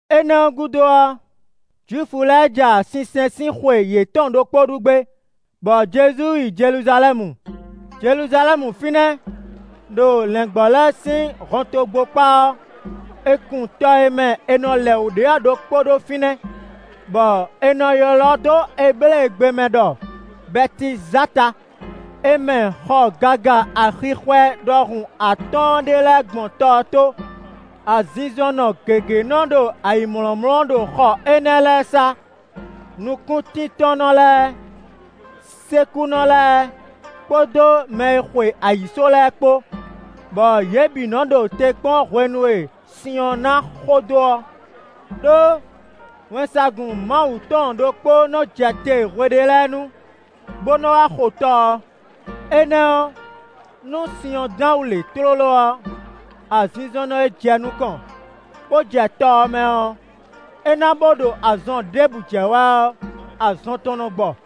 Énɛ́ ɔ́ gúdo ɔ́, Jwifu lɛ́ɛ ja sinsɛn sín xwe yětɔn ɖokpó ɖu gbé, bɔ Jezu yi Jeluzalɛ́mu. Jeluzalɛ́mu fínɛ́, ɖo lɛ̌ngbɔ́ lɛ́ɛ sín hɔntogbó kpá ɔ́, è kun tɔ e mɛ è nɔ lɛ wǔ ɖe ɔ́ ɖokpó ɖó fínɛ́, bɔ è nɔ ylɔ́ dó Ebléegbe mɛ ɖɔ Bɛtizata; è mɛ xɔ gaga axixwɛ ɖɔhun atɔ́ɔ́n ɖé lɛ́ɛ gbɔn tɔ ɔ́ tó. Azinzɔnnɔ gěgé nɔ ɖo ayǐmlɔ́mlɔ́ ɖo xɔ énɛ́ lɛ́ɛ sá: Nukúntíntɔ́nnɔ lɛ́ɛ, sékúnɔ lɛ́ɛ, kpódó mɛ e xwe ayǐsó lɛ́ɛ kpó; [bɔ yě bǐ nɔ ɖo te kpɔ́n hwenu e sin ɔ́ ná xo dó ɔ́. Đó wɛnsagun Mawu tɔn ɖokpó nɔ jɛ te hwe ɖé lɛ́ɛ nu, bó nɔ wá xo tɔ ɔ́. Énɛ́ ɔ́, nú sin ɔ́ dán wǔ lě tlóló ɔ́, azinzɔnnɔ e jɛ nukɔn, bó jɛ tɔ ɔ́ mɛ ɔ́, é ná bó ɖo azɔn ɖěbǔ jɛ wɛ ɔ́, azɔn tɔn nɔ gbɔ.]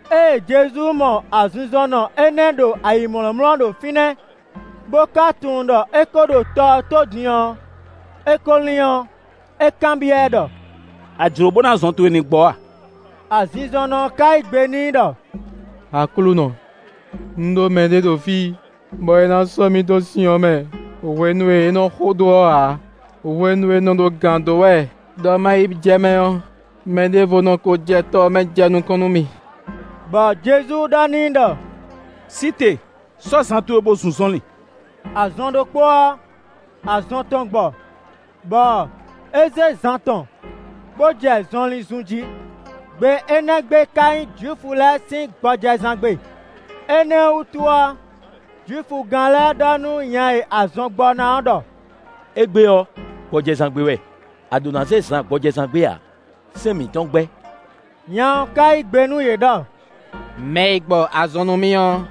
Ée Jezu mɔ azinzɔnnɔ énɛ́ ɔ́ ɖo ayǐmlɔ́mlɔ́ ɖo fínɛ́, bó ka tunwun ɖɔ é kó ɖo tɔ ɔ́ tó din ɔ́, é ko lín ɔ́, é kanbyɔ́ ɛ ɖɔ: “A jlǒ bónú azɔn towe ní gbɔ a?” Azinzɔnnɔ ɔ́ ka yí gbe n'i ɖɔ: “Aklúnɔ, un ɖó mɛɖé ɖo fí bɔ é ná sɔ́ mì dó sin ɔ́ mɛ hwenu e é nɔ xo dó ɔ́ ǎ; hwenu e un nɔ ɖo gǎn dó wɛ ɖɔ ma yi jɛ mɛ ɔ́, mɛ ɖěvo nɔ ko jɛ tɔ ɔ́ mɛ jɛ nukɔn nú mì.” Bɔ Jezu ɖɔ n'i ɖɔ: “Sí te, sɔ́ zan towe bo zun zɔnlin.” Azɔn ɖokpó ɔ́, azɔn tɔn gbɔ, bɔ é zé zan tɔn bó jɛ zɔnlin zun jí; gbe énɛ́ gbe ká nyí Jwifu lɛ́ɛ sín gbɔjɛzán gbe. Énɛ́ ɔ́ wútu ɔ́, Jwifugán lɛ́ɛ ɖɔ nú nya e azɔn gbɔ ná ɔ́ ɖɔ: “Égbé ɔ́, gbɔjɛzán gbe wɛ; a ɖǒ ná zé zan gbɔjɛzán gbe ǎ, sɛ́n mǐtɔn gbɛ́.” Nya ɔ́ ká yí gbe nú yě ɖɔ: “Mɛ e gbɔ azɔn nú mì ɔ́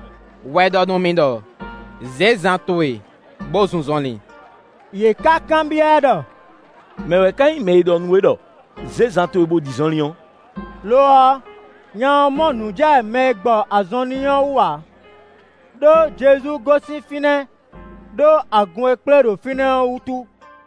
wɛ ɖɔ nú mì ɖɔ: ‘Zě zan towe bo zun zɔnlin.’” Yě ká kanbyɔ́ ɛ ɖɔ: “Mɛ̌ ká nyí mɛ e ɖɔ nú we ɖɔ: ‘Zě zan towe bo ɖi zɔnlin’ ɔ́?” Lo ɔ́, nya ɔ́ mɔ nǔ jɛ mɛ e gbɔ azɔn n'i ɔ́ wú ǎ, ɖó Jezu gosín fínɛ́ ɖó agun e kplé ɖo fínɛ́ ɔ́ wútu.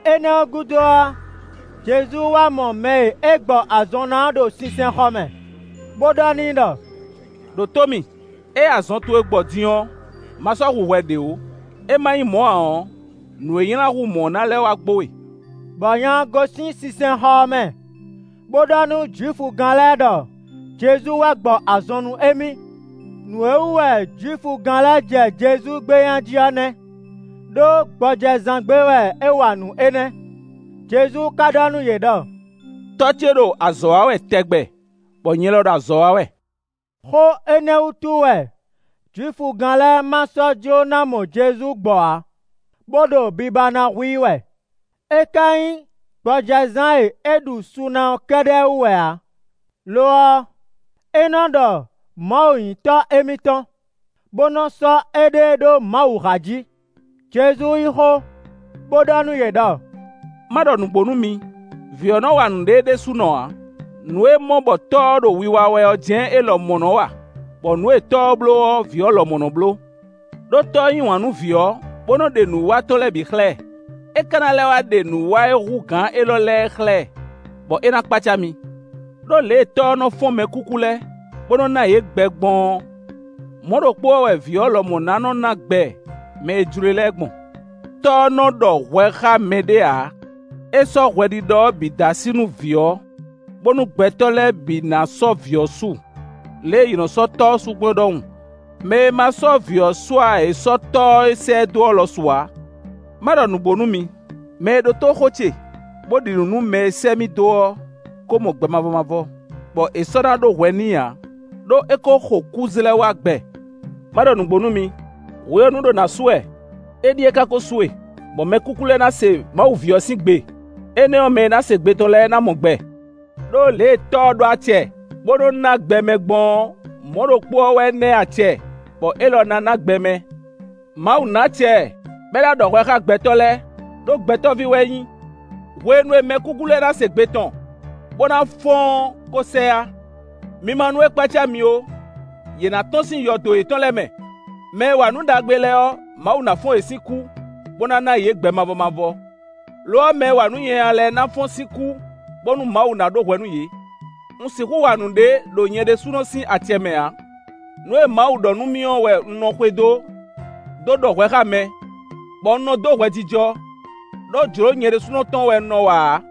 Énɛ́ ɔ́ gúdo ɔ́, Jezu wá mɔ mɛ e é gbɔ azɔn ná ɔ́ ɖo sinsɛnxɔ mɛ, bo ɖɔ n'i ɖɔ: “Đǒtó mì! Ée azɔn towe gbɔ din ɔ́, ma sɔ́ hu hwɛ ɖě ó, é ma nyí mɔ ǎ ɔ́, nǔ e nylá hú mɔ ɔ́ ná lɛ́ wá gbo we.” Bɔ nya ɔ́ gosín sinsɛnxɔ ɔ́ mɛ, bó ɖɔ nú Jwifugán lɛ́ɛ ɖɔ Jezu wɛ gbɔ azɔn nú émí. Nǔ e wú wɛ Jwifugán lɛ́ɛ jɛ Jezu gbé nya jí ɔ́ nɛ́, ɖó gbɔjɛzán gbe wɛ é wa nǔ énɛ́. Jezu ka ɖɔ nú yě ɖɔ: “Tɔ́ ce ɖo azɔ̌ wa wɛ tɛgbɛ, bɔ nyɛ lɔ ɖo azɔ̌ wa wɛ.” Xó énɛ́ wútu wɛ Jwifugán lɛ́ɛ ma sɔ́ jló ná mɔ Jezu gbɔ ǎ, bó ɖo biba ná hu i wɛ; é ka nyí gbɔjɛzán e é ɖu su na ɔ́ kɛ́ɖɛ́ wú wɛ ǎ; lo ɔ́, é nɔ́ ɖɔ Mawu nyí Tɔ́ émítɔn, bó nɔ́ sɔ́ éɖée ɖó Mawu há jí. Jezu yí xó, bó ɖɔ nú yě ɖɔ: “Ma ɖɔ nǔgbó nú mi; Vǐ ɔ́ nɔ wa nǔɖé é ɖésúnɔ ǎ; nǔ e é mɔ bɔ Tɔ́ ɔ́ ɖo wiwa wɛ ɔ́ jɛ́n é lɔmɔ̌ nɔ wa; bɔ nǔ e Tɔ́ ɔ́ bló ɔ́, Vǐ ɔ́ lɔmɔ̌ nɔ bló. Đó Tɔ́ ɔ́ yí wǎn nú Vǐ ɔ́, bo nɔ ɖe nǔwiwa tɔn lɛ́ɛ bǐ xlɛ́ ɛ; é ka na lɛ́ wá ɖe nǔwiwa e hú gǎn élɔ́ lɛ́ɛ é xlɛ́ ɛ, bɔ é ná kpácá mi. Đó lě e Tɔ́ ɔ́ nɔ fɔ́n mɛkúkú lɛ́ɛ, bó nɔ ná yě gbɛ gbɔn ɔ́, mɔ̌ ɖokpó ɔ́ wɛ Vǐ ɔ́ lɔmɔ̌ nɔ ná gbɛ mɛ e jló e lɛ́ɛ gbɔn. Tɔ́ ɔ́ nɔ ɖɔ hwɛ xá mɛɖé ǎ. É sɔ́ hwɛɖiɖɔ ɔ́ bǐ dó así nú Vǐ ɔ́; bónú gbɛtɔ́ lɛ́ɛ bǐ ná sɔ́ Vǐ ɔ́ su, lě e yě nɔ sɔ́ Tɔ́ ɔ́ su gbɔn é ɖɔhun. Mɛ e ma sɔ́ Vǐ ɔ́ su ǎ ɔ́, é sɔ́ Tɔ́ e sɛ́ ɛ dó ɔ́ lɔ su ǎ. “Má ɖɔ nǔgbó nú mi: mɛ e ɖótó xó ce, bó ɖi nǔ nú mɛ e sɛ́ mì dó ɔ́ kó mɔ gbɛ mavɔ mavɔ, bɔ è sɔ́ ná ɖó hwɛ n'i ǎ, ɖó é kó xo kú zlɛ́ wá gbɛ. Má ɖɔ nǔgbó nú mi: hwe ɔ́ nu ɖo na su wɛ; éɖíe ka ko su e, bɔ mɛkúkú lɛ́ɛ ná se Mawu ví ɔ́ sín gbe; énɛ́ ɔ́, mɛ e ná se gbe tɔn lɛ́ɛ ná mɔ gbɛ. Đó lě e Tɔ́ ɔ́ ɖó acɛ, bó nɔ ná gbɛ mɛ gbɔn ɔ́, mɔ̌ ɖokpó ɔ́ wɛ é ná ɛ acɛ, bɔ élɔ́ ná ná gbɛ mɛ. Mawu ná acɛ ɛ, bɔ é ná ɖɔ hwɛ xá gbɛtɔ́ lɛ́ɛ, ɖó Gbɛtɔ́ví wɛ é nyí. Hwenu e mɛkúkú lɛ́ɛ ná se gbe tɔn, bó ná fɔ́n ɔ́ ko sɛ yá; mi ma nú é kpácá mi ó. Yě ná tɔ́n sín yɔdo yětɔn lɛ́ɛ mɛ; mɛ e wa nǔ ɖagbe lɛ́ɛ ɔ́, Mawu ná fɔ́n yě sín kú, bó ná ná yě gbɛ mavɔ mavɔ. Lo ɔ́, mɛ e wa nǔ nyanya lɛ́ɛ ná fɔ́n sín kú, bónú Mawu ná ɖó hwɛ nú yě.” “Un sixú wa nǔɖé ɖo nyɛ ɖésúnɔ sín acɛ mɛ ǎ. Nǔ e Mawu ɖɔ nú mì ɔ́ wɛ un nɔ xwedó dó ɖɔ hwɛ xá mɛ, bɔ un nɔ dó hwɛjijɔ, ɖó jlǒ nyɛ ɖésúnɔ tɔn wɛ un nɔ wa ǎ;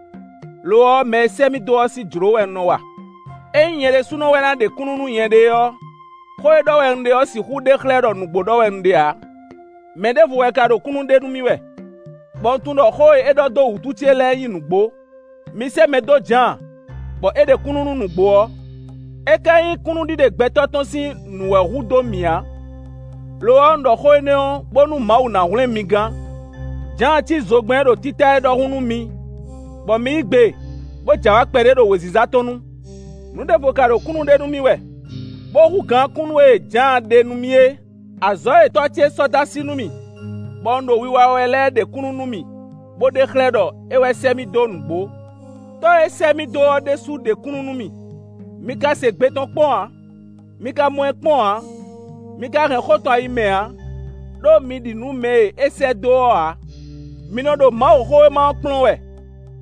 lo ɔ́, mɛ e sɛ́ mì dó ɔ́ sín jlǒ wɛ un nɔ wa. “Ényí nyɛ ɖésú wɛ na ɖe kúnnu nú nyɛɖée ɔ́, xó e ɖɔ wɛ un ɖe ɔ́ sixú ɖe xlɛ́ ɖɔ nǔgbó ɖɔ wɛ un ɖe ǎ. Mɛ ɖěvo wɛ ka ɖo kúnnu ɖe nú mì wɛ, bɔ un tunwun ɖɔ xó e é ɖɔ dó wútu ce lɛ́ɛ nyí nǔgbó. Mi sɛ́ mɛ dó Jǎan, bɔ é ɖe kúnnu nú nǔgbó ɔ́. É ka nyí kúnnuɖiɖe gbɛtɔ́ tɔn sín nǔ wɛ hu dó mì ǎ; lo ɔ́, un ɖɔ xó énɛ́ ɔ́, bónú Mawu ná hwlɛ́n mi gán. Jǎan cí zogbɛ́n e ɖo títá é ɖɔhun nú mi, bɔ mi yí gbe bó j'awǎ kpɛɖé ɖo wěziza tɔn nu. Nǔ ɖěvo ka ɖo kúnnu ɖe nú mì wɛ, bó hú gǎn kúnnu e Jǎan ɖe nú mì é. Azɔ̌ e Tɔ́ ce sɔ́ dó así nú mì, bɔ un ɖo wiwa wɛ lɛ́ɛ ɖe kúnnu nú mì bo ɖe xlɛ́ ɖɔ é wɛ sɛ́ mì dó nǔgbó. Tɔ́ e sɛ́ mì dó ɔ́ ɖésú ɖe kúnnu nú mì. Mi ka se gbe tɔn kpɔ́n ǎ; mi ka mɔ ɛ kpɔ́n ǎ; mi ka hɛn xó tɔn ayi mɛ ǎ; ɖó mi ɖi nǔ nú mɛ e é sɛ́ dó ɔ́ ǎ. Mi nɔ ɖo Mawuxówéma ɔ́ kplɔ́n wɛ,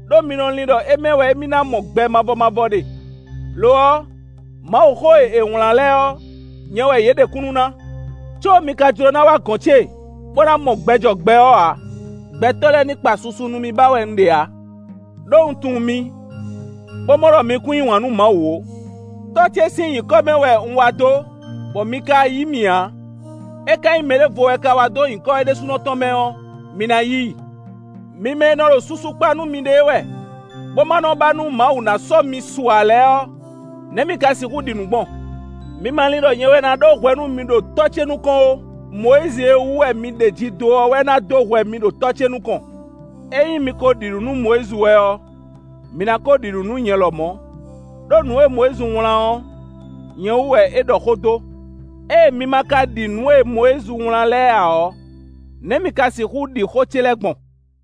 ɖó mi nɔ lin ɖɔ é mɛ wɛ émí ná mɔ gbɛ mavɔ mavɔ ɖe; lo ɔ́, Mawuxó e è wlán lɛ́ɛ ɔ́, nyɛ wɛ yě ɖe kúnnu ná. Có mi ka jló ná wá gɔ̌n ce, bó ná mɔ gbɛ jɔ gbɛ ɔ́ ǎ. “Gbɛtɔ́ lɛ́ɛ ní kpa susu nú mì ba wɛ un ɖe ǎ. Đó un tunwun mi, bó mɔ ɖɔ mi kún yí wǎn nú Mawu ó. Tɔ́ ce sín nyǐkɔ mɛ wɛ un wá dó, bɔ mi ka yí mì ǎ; é ka nyí mɛ ɖěvo wɛ ka wá ɖo nyǐkɔ é ɖésúnɔ tɔn mɛ ɔ́, mi ná yí i. Mi mɛ e nɔ ɖo susu kpa nú miɖée wɛ, bó ma nɔ ba nú Mawu ná sɔ́ mi su ǎ lɛ́ɛ ɔ́, nɛ̌ mi ka sixú ɖi nǔ gbɔn? Mi ma lin ɖɔ nyɛ wɛ ná dó hwɛ mi ɖo Tɔ́ ce nukɔn ó; Mɔyízi e wú wɛ mi ɖeji dó ɔ́ wɛ ná dó hwɛ mi ɖo Tɔ́ ce nukɔn. Ényí mi ko ɖi nǔ nú Mɔyízi wɛ ɔ́, mi ná ko ɖi nǔ nú nyɛ lɔmɔ̌; ɖó nǔ e Mɔyízi wlán ɔ́, nyɛ wú wɛ é ɖɔ xó dó. Ée mi ma ka ɖi nǔ e Mɔyízi wlán lɛ́ɛ ǎ ɔ́, nɛ̌ mi ka sixú ɖi xó ce lɛ́ɛ gbɔn?”